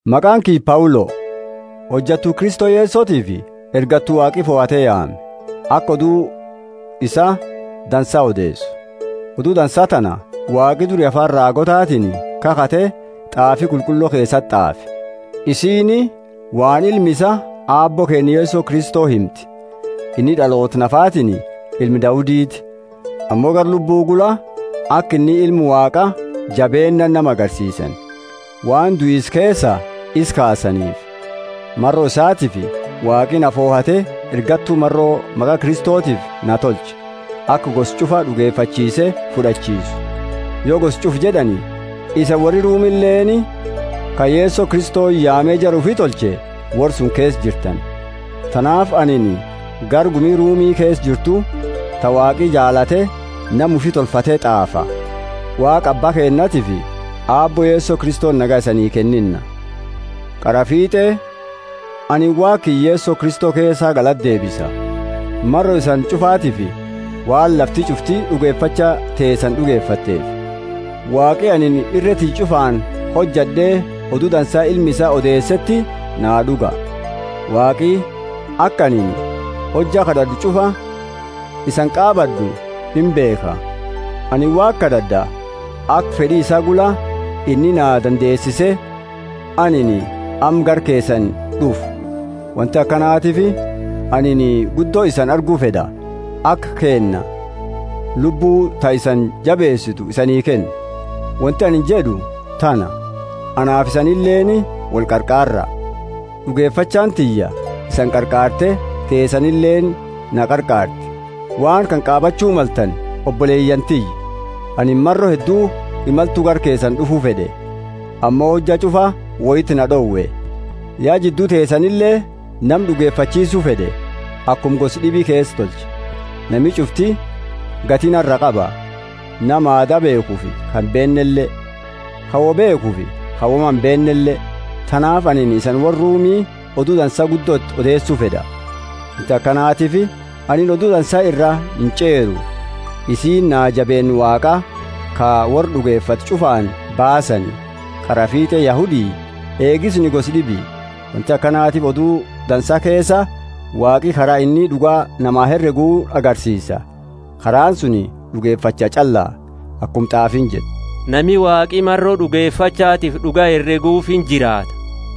Maqaani kiyya Paulo, hojattu Kristo Yesotiifi ergattu Waaqi fohate yaame, aka Odu isaa Dansa odeesu. Odu Dansa tana Waaqi duri afaani raagootatiini kakhate t'aafi qulqullo keesati t'aafani. Isiini waan Ilma isaa Aabbo keenna Yeso Kristo himti: inni d'aloota nafatiini ilma Dauditi, ammo gara Lubbu Qulqullo gula aka inni Ilma Waaqa jabeennaani nama agarsiisani, waan duisa keesaa isa kaasaniifi. Maro isaatiifi Waaqi na fohate ergattu maro maqa Kristotiifi na tolche, aka gosa ch'ufa d'ugefachiise fud'achiisu. Yo gosa ch'ufa jed'ani, isani worri Rumileeni, ka Yeso Kristoni yaame jara ufi tolche, worra suni keesa jirtani. Tanaafi anini gara gumi Rumi keesa jirtu ta Waaqi jaalate nama ufi tolfateti t'aafa: Waaqa Abba keennatiifi Aabbo Yeso Kristoni nagaya isanii kennina. Qaraa fit'e anini Waaqa kiyya Yeso Kristo keesa galata deebisa, maro isani ch'ufatiifi, waan lafti ch'ufti d'ugefacha teesani d'ageeteefi. Waaqi anini irre tiyya ch'ufaani hojad'e Odu Dansa Ilma isaa odeeseeti naa d'uga. Waaqi aka anini hojja kad'ad'u ch'ufa isani qaabad'u imbeekha. Anini Waaqa kad'ad'a aka fed'i isaa gula inni na dandeesise, anini amma gara keesani d'ufu. Wonti akanatiifi anini guddo isani argu fed'a, aka kenna Lubbu ta isani jabeesitu isanii kennu. Wonti anini jed'u tana, anaafi isanileeni wolqarqaarra: d'ugefachaani tiyya isani qarqaarte, teesanileeni na qarqaarti. Waan kana qaabachu maltani, oboleyaani tiyya: anini maro heddu imaltu gara keesani d'ufu fed'e, ammo hojja ch'ufa woiti na d'owe. Ya jiddu teesanile nama d'ugefachiisu fed'e, akuma gosa d'ibi keesa tolche. Nami ch'ufti gati nara qaba, nama aada beekhufi ka imbeennele, ka woi beekhufi ka woma imbeennele. Tanaafi anini isani worra Rumile Odu Dansa guddo iti odeesu fed'a. Wonti akanatiifi anini Odu Dansa iraa inch'eeru: isiini jabeenna Waaqa ka worra d'ugefate ch'ufaani baasani, qaraa fiit'e Yahudi eegi suni gosa d'ibi. Wonti akanatiifi Odu Dansa keesa Waaqi kara inni d'uga nama hereguuni agarsiisa: karaani suni d'ugefacha ch'alla. Akuma t'aafiini jettu, Nami Waaqi maro d'ugefachatifi d'uga hereguufi injiraata.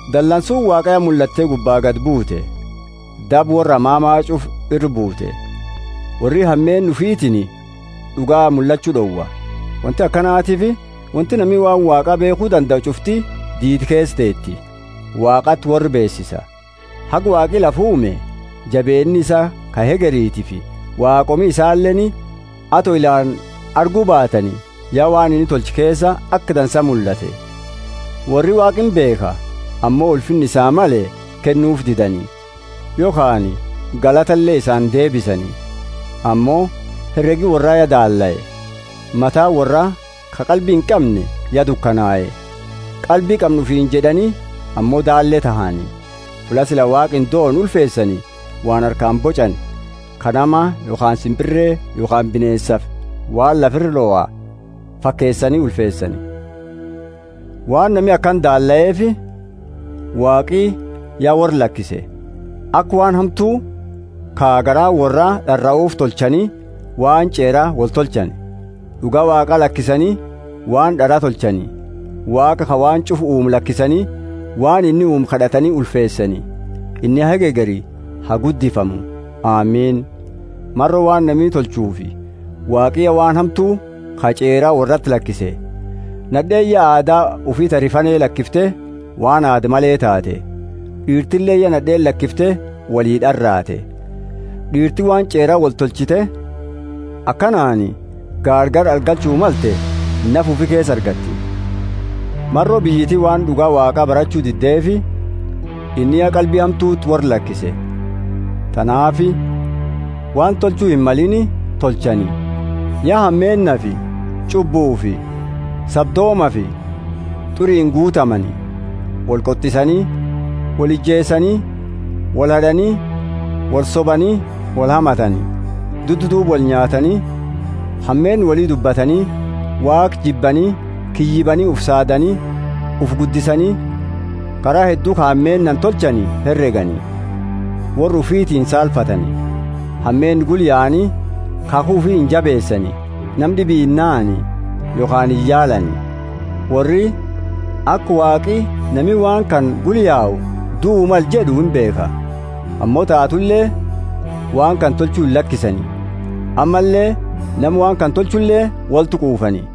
Dalansuuni Waaqa ya mullatte gubbaa gadi buute, daba worra hamama ch'ufa ira buute. Worri hameenna ufitiini d'uga mullachu d'owa. Wonti akanatiifi wonti nami waan Waaqa beekhu dandau ch'ufti diida keesa teeti Waaqati worra beesise. Haga Waaqi lafa uume jabeenna isaa ka hegeretiifi, waaqoomi isaaleeni, ato ilaani argu baatani, ya waan inni tolche keesa aka dansa mullate. Worri Waaqa imbeekha, ammo ulfinna isaa male kennuufi didani, yokhaani galatale isa indeebisani. Ammo heregi worra ya daallae, mataani worra ka qalbi inqamne ya dukanae. Qalbi qamna ufiini jed'ani, ammo daalle tahani; fulla sila Waaqa indoone ulfeesani waan harkaani boch'ani ka nama yokhaani simpirre yokhaani bineensafi waan lafa ira loha fakeesani ulfeesani. Waan nami akana daalleefi, Waaqi ya worra lakise, aka waan hamtu ka garaani worraa d'araufi tolchani waan ch'eera woli tolchani. D'uga Waaqaa lakisani waan d'ara tolchani, Waaqa ka waan ch'ufa uume lakisani, waan inni uume kad'atani ulfeesani. Inni haga hegeri ha guddifamu! Amini. Maro waan nami tolchuufi, Waaqi ya waan hamtu ka ch'eera worrati lakise. Nad'eeni ya aada ufi ta rifane lakifte waan aada male taate. D'iirtileeni ya nad'eeni lakifte wolid'araate. D'iirti waan ch'eera woltolchite, akanaani gaargala argachu malte nafa ufi keesa argatti. Maro biyyiti waan d'uga Waaqa barachu diddeefi, inni ya qalbi hamtuti worra lakise, tanaafi waan tolchu himmalini tolchani. Ya hameennafi ch'ubbufi sabdoomafi t'uriini guutamani; wolqot'isani, wolijeesani, wolhad'ani, wolsobani, wolhamatani. Duddaduuba wolnyaatani, hameenna woli dubbatani; Waaqa jibbani, kiyyibaani, ufi saadani, ufi guddisani; kara heddu ka hameennaani tolchani heregani; worra ufiti insaalfatani; hameenna gula yaani, kakhu ufi injabeesani, nama d'ibi inahani yokhaani iyaalani. Worri aka Waaqi nami waan kana gula yau duaa male jed'u imbeekha. Ammo taatule waan kana tolchu illakisani, ammalle nama waan kana tolchule wolti quufani.